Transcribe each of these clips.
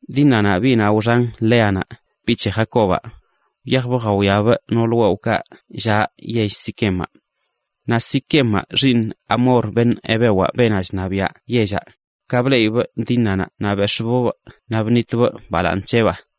Dínanaꞌ, biꞌnaꞌ wxan Léanaꞌ, biꞌ c̱he Jacobaꞌ, wyajbꞌ jawiabꞌ noolə wewꞌkaꞌ llaꞌ yell Siquemaꞌ. Naꞌ Siquemaꞌ, xiiṉ Hamoraꞌ, beṉꞌ hevewaꞌ, beenaꞌ chṉabiaꞌ yellaꞌ, ka bleꞌibꞌ Dínanaꞌ naꞌ bex̱ꞌbꞌbꞌ naꞌ bṉitbꞌ balaaṉ c̱heꞌbaa.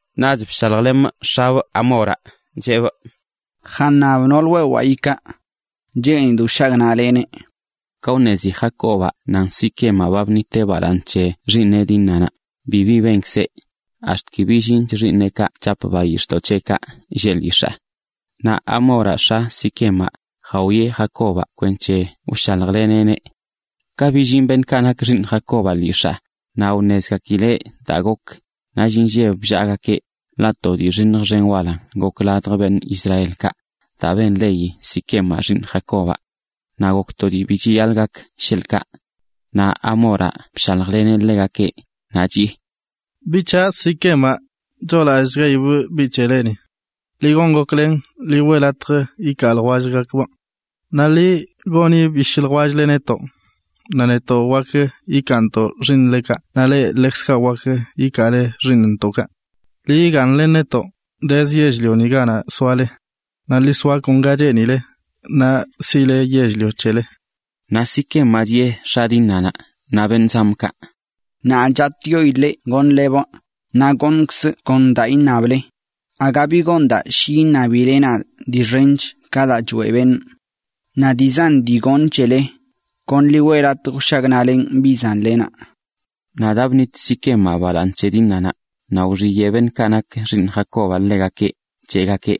Naꞌch bshaljlemꞌ x̱ab, Hamoraꞌ, cheꞌbꞌ: ―Jaṉab noolə wewaa ikaa. Cheenidꞌ wshagnaꞌlemꞌ. Ka wṉezi Jacobaꞌ nan Siquemaꞌ ba bṉitbꞌ balaaṉ c̱he xiiṉeꞌ Dínanaꞌ bibi benkzeꞌ ax̱t ki billinch xiiṉeꞌkaꞌ chap bayix̱ꞌdoꞌ c̱heꞌkaꞌ lleꞌ lyix̱aa. Naꞌ Hamoraꞌ, x̱a Siquemaꞌ, jawieꞌ Jacobaꞌ kwenc̱he wshaljleneꞌneꞌ. Ka billin beṉꞌkaꞌ nak xiiṉ Jacobaꞌ lyix̱aa, naꞌ wṉezgakileꞌ daa gok, nall inlleb bllaagakeꞌ, ḻaꞌ to dii xiṉj xen walanꞌ gok ladj beṉꞌ Israelkaꞌ daa bṉit Siquemaꞌ balaaṉ c̱he xiiṉ Jacobaꞌ. Naꞌ gok to dii bi chiyaḻꞌ gak sheḻꞌkaꞌ. Naꞌ Hamoraꞌ bshaljleneꞌ ḻegakeꞌ, naꞌ chiꞌe: ― Biꞌ c̱haꞌ, Siquemaꞌ, choolallchgaibꞌ biꞌ c̱heleni. Ḻi gon goklen ḻi weꞌ latj ikaa ljwellgakbꞌ. Naꞌ ḻi goni bishꞌ ljwell-le netoꞌ, naꞌ netoꞌ wakə ikaantoꞌ xiiṉlekaꞌ naꞌ leꞌ ḻekzkaꞌ wakə ikaale xiiṉntoꞌkaꞌ. Ḻi yigaaṉlen netoꞌ, dezə yell-lioni ganaꞌ soale. Naꞌ ḻi soa kon ga cheenileꞌ, naꞌ siꞌle yell-lio c̱hele. Naꞌ cheꞌ Siquemaꞌ x̱a Dínanaꞌ naꞌ beṉꞌ zamꞌkaꞌ: ―Nadꞌ chatꞌyoidꞌ leꞌ goṉlebꞌ, naꞌ goṉkzꞌ kon daa iṉable. Aga bi gon daa shi iṉabile nadꞌ dii xench ka daa choeꞌ beṉꞌ. Naꞌ dii zan dii goṉꞌ c̱hele. Kon ḻi weꞌ latj wshagnaꞌlenꞌ biꞌ zanlenaꞌ. Naꞌ daa bṉit Siquemaꞌ balaaṉ c̱he Dínanaꞌ, naꞌ wxiyeꞌ beṉꞌkaꞌ nak xiiṉ Jacobaꞌ ḻegakeꞌ, cheꞌgakeꞌ: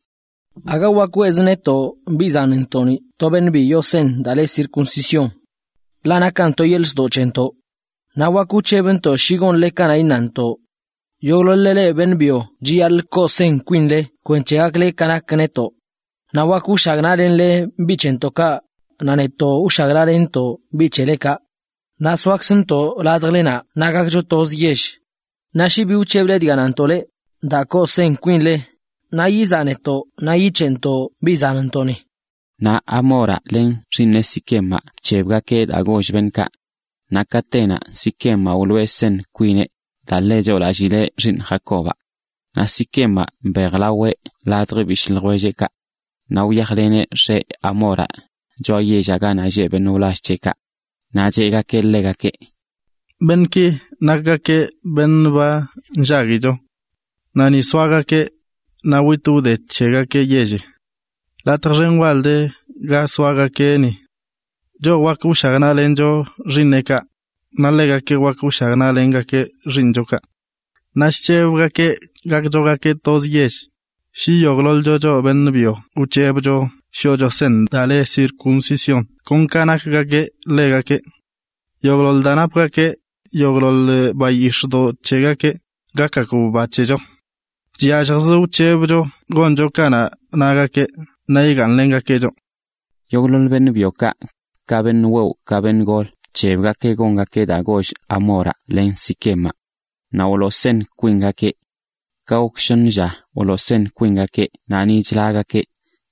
―Aga wakə weꞌzə netoꞌ biꞌ zanntoꞌni to beṉꞌ bi yoo seṉ daa le circuncisión. Ḻaꞌ nakan to yeḻꞌ ztoꞌ c̱hentoꞌ. Naꞌ wak wc̱hebntoꞌ shi gonle ka iṉantoꞌ. Yogꞌḻoḻ-le leꞌ beṉꞌ byo chiyaḻꞌ koo seṉ kwinle kwenc̱he gakle ka nak netoꞌ. Naꞌ wakə wshagnaꞌlenle biꞌ c̱hentoꞌkaꞌ, naꞌ netoꞌ wshagnaꞌlentoꞌ bi c̱helekaꞌ, naꞌ soakzntoꞌ ladjlenaꞌ naꞌ gakcho toz yell. Naꞌ shi bi wc̱heble dga nantoꞌ leꞌ, daa koo seṉ kwinle, naꞌ yizaꞌ netoꞌ naꞌ yic̱heꞌntoꞌ biꞌ zanntoꞌni. Naꞌ Hamoraꞌ len xiiṉeꞌ Siquemaꞌ bc̱hebgakeꞌ daa goll beṉꞌkaꞌ. Naꞌ katenaꞌ Siquemaꞌ wloo seṉ kwimꞌ, daa ḻe choolallibꞌ xiiṉ Jacobaꞌ. Naꞌ Siquemaꞌ mbejlaobꞌ ladj bishꞌ ljwellbꞌkaꞌ. Naꞌ wyajlemꞌ x̱abꞌ, beenaꞌ le Hamor, choꞌa yellaꞌ ganaꞌ lleꞌ beṉꞌ wlall c̱heꞌkaꞌ. Naꞌ cheꞌgakeꞌ ḻegakeꞌ: ―Beṉꞌki nakgakeꞌ beṉꞌ ba nllaguicho. Naꞌ ni soagakeꞌ, naꞌ witꞌ wde c̱hegakeꞌ yelli. Latj xen wal de ga soagakeꞌ ni. Choꞌ wakə wshagnaꞌlencho xiiṉeꞌkaꞌ, naꞌ ḻegakeꞌ wakə wshagnaꞌlengakeꞌ xiiṉchokaꞌ. Naꞌ chc̱hebgakeꞌ gakchogakeꞌ toz yell, shi yogꞌḻoḻcho choꞌ beṉꞌ byo wc̱hebcho shoꞌcho seṉ daa le circuncisión kon ka nakgakeꞌ ḻegakeꞌ. Yogꞌḻoḻ daa napgakeꞌ, yogꞌḻoḻ bayix̱ꞌdoꞌ c̱hegakeꞌ, gakgakb ba c̱hecho. Chyalljzə wc̱hebcho goncho ka nagakeꞌ naꞌ yigaaṉlengakeꞌ choꞌ. Yogꞌḻoḻ beṉꞌ byokaꞌ, ka beṉꞌ wewꞌ ka beṉꞌ gol bc̱hebgakeꞌ gongakeꞌ daa goll Hamoraꞌ len Siquemaꞌ. Naꞌ wloo seṉ kwingakeꞌ. Ka gok shoṉə lla wloo seṉ kwingakeꞌ naꞌ ni chlagakeꞌ,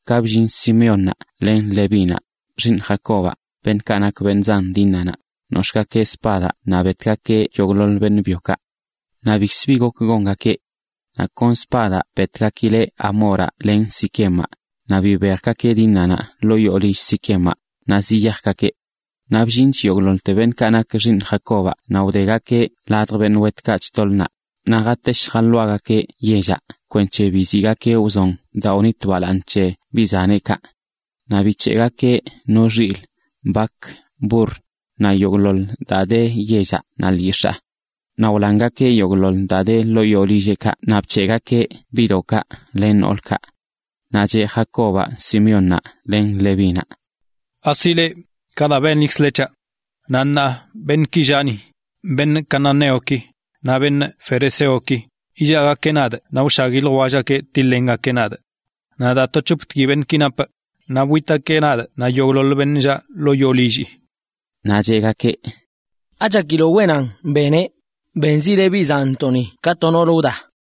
ka bllin Simeónnaꞌ len Levínaꞌ, xiiṉ Jacobaꞌ, beṉꞌkaꞌ nak beṉꞌ zan Dínanaꞌ, nox̱ꞌgakeꞌ spadaꞌ naꞌ betgakeꞌ yogꞌḻoḻ beṉꞌ byokaꞌ. Naꞌ bikzə bi gok gongakeꞌ. Naꞌ kon spadaꞌ betgakileꞌ Hamoraꞌ len Siquemaꞌ, naꞌ bibejgakeꞌ Dínanaꞌ ḻoo yoo lill Siquemaꞌ, naꞌ ziyajgakeꞌ. Naꞌ bllinch yogꞌḻoḻte beṉꞌkaꞌ nak xiiṉ Jacobaꞌ naꞌ wdegakeꞌ ladj beṉꞌ wetkaꞌ chtoḻ naꞌ, naꞌ jatesh jaḻoagakeꞌ yellaꞌ kwenc̱he biziꞌgakeꞌ wzon daa wnit balaaṉ c̱he biꞌ zaneꞌkaꞌ. Naꞌ bic̱heꞌgakeꞌ no xilꞌ, bak, burr, naꞌ yogꞌḻoḻ daa de yellaꞌ naꞌ lyix̱aa. Naꞌ wlangakeꞌ yogꞌḻoḻ daa de ḻoo yoo lilleꞌkaꞌ naꞌ bc̱heꞌgakeꞌ biꞌdoꞌkaꞌ len noolkaꞌ. Naꞌ cheꞌ Jacobaꞌ Simeónnaꞌ len Levínaꞌ: ―Asi leꞌ, ka daa benlikzle c̱haꞌ. Naꞌ ṉaa beṉꞌki lleꞌ ni, cananeoki naꞌ ferezeoki, illaagakeꞌ nadꞌ naꞌ wshagui ljwellgakeꞌ tiḻ-lengakeꞌ nadꞌ. Naꞌ daa to c̱hoptgui beṉꞌki napꞌ, naꞌ witgakeꞌ nadꞌ naꞌ yogꞌḻoḻ beṉꞌ llaꞌ ḻoo yoo lillii. Naꞌ cheꞌgakeꞌ: ―¿Achakiloꞌ wenan beneꞌ, benzileꞌ biꞌ zanntoꞌni ka to noolə wda?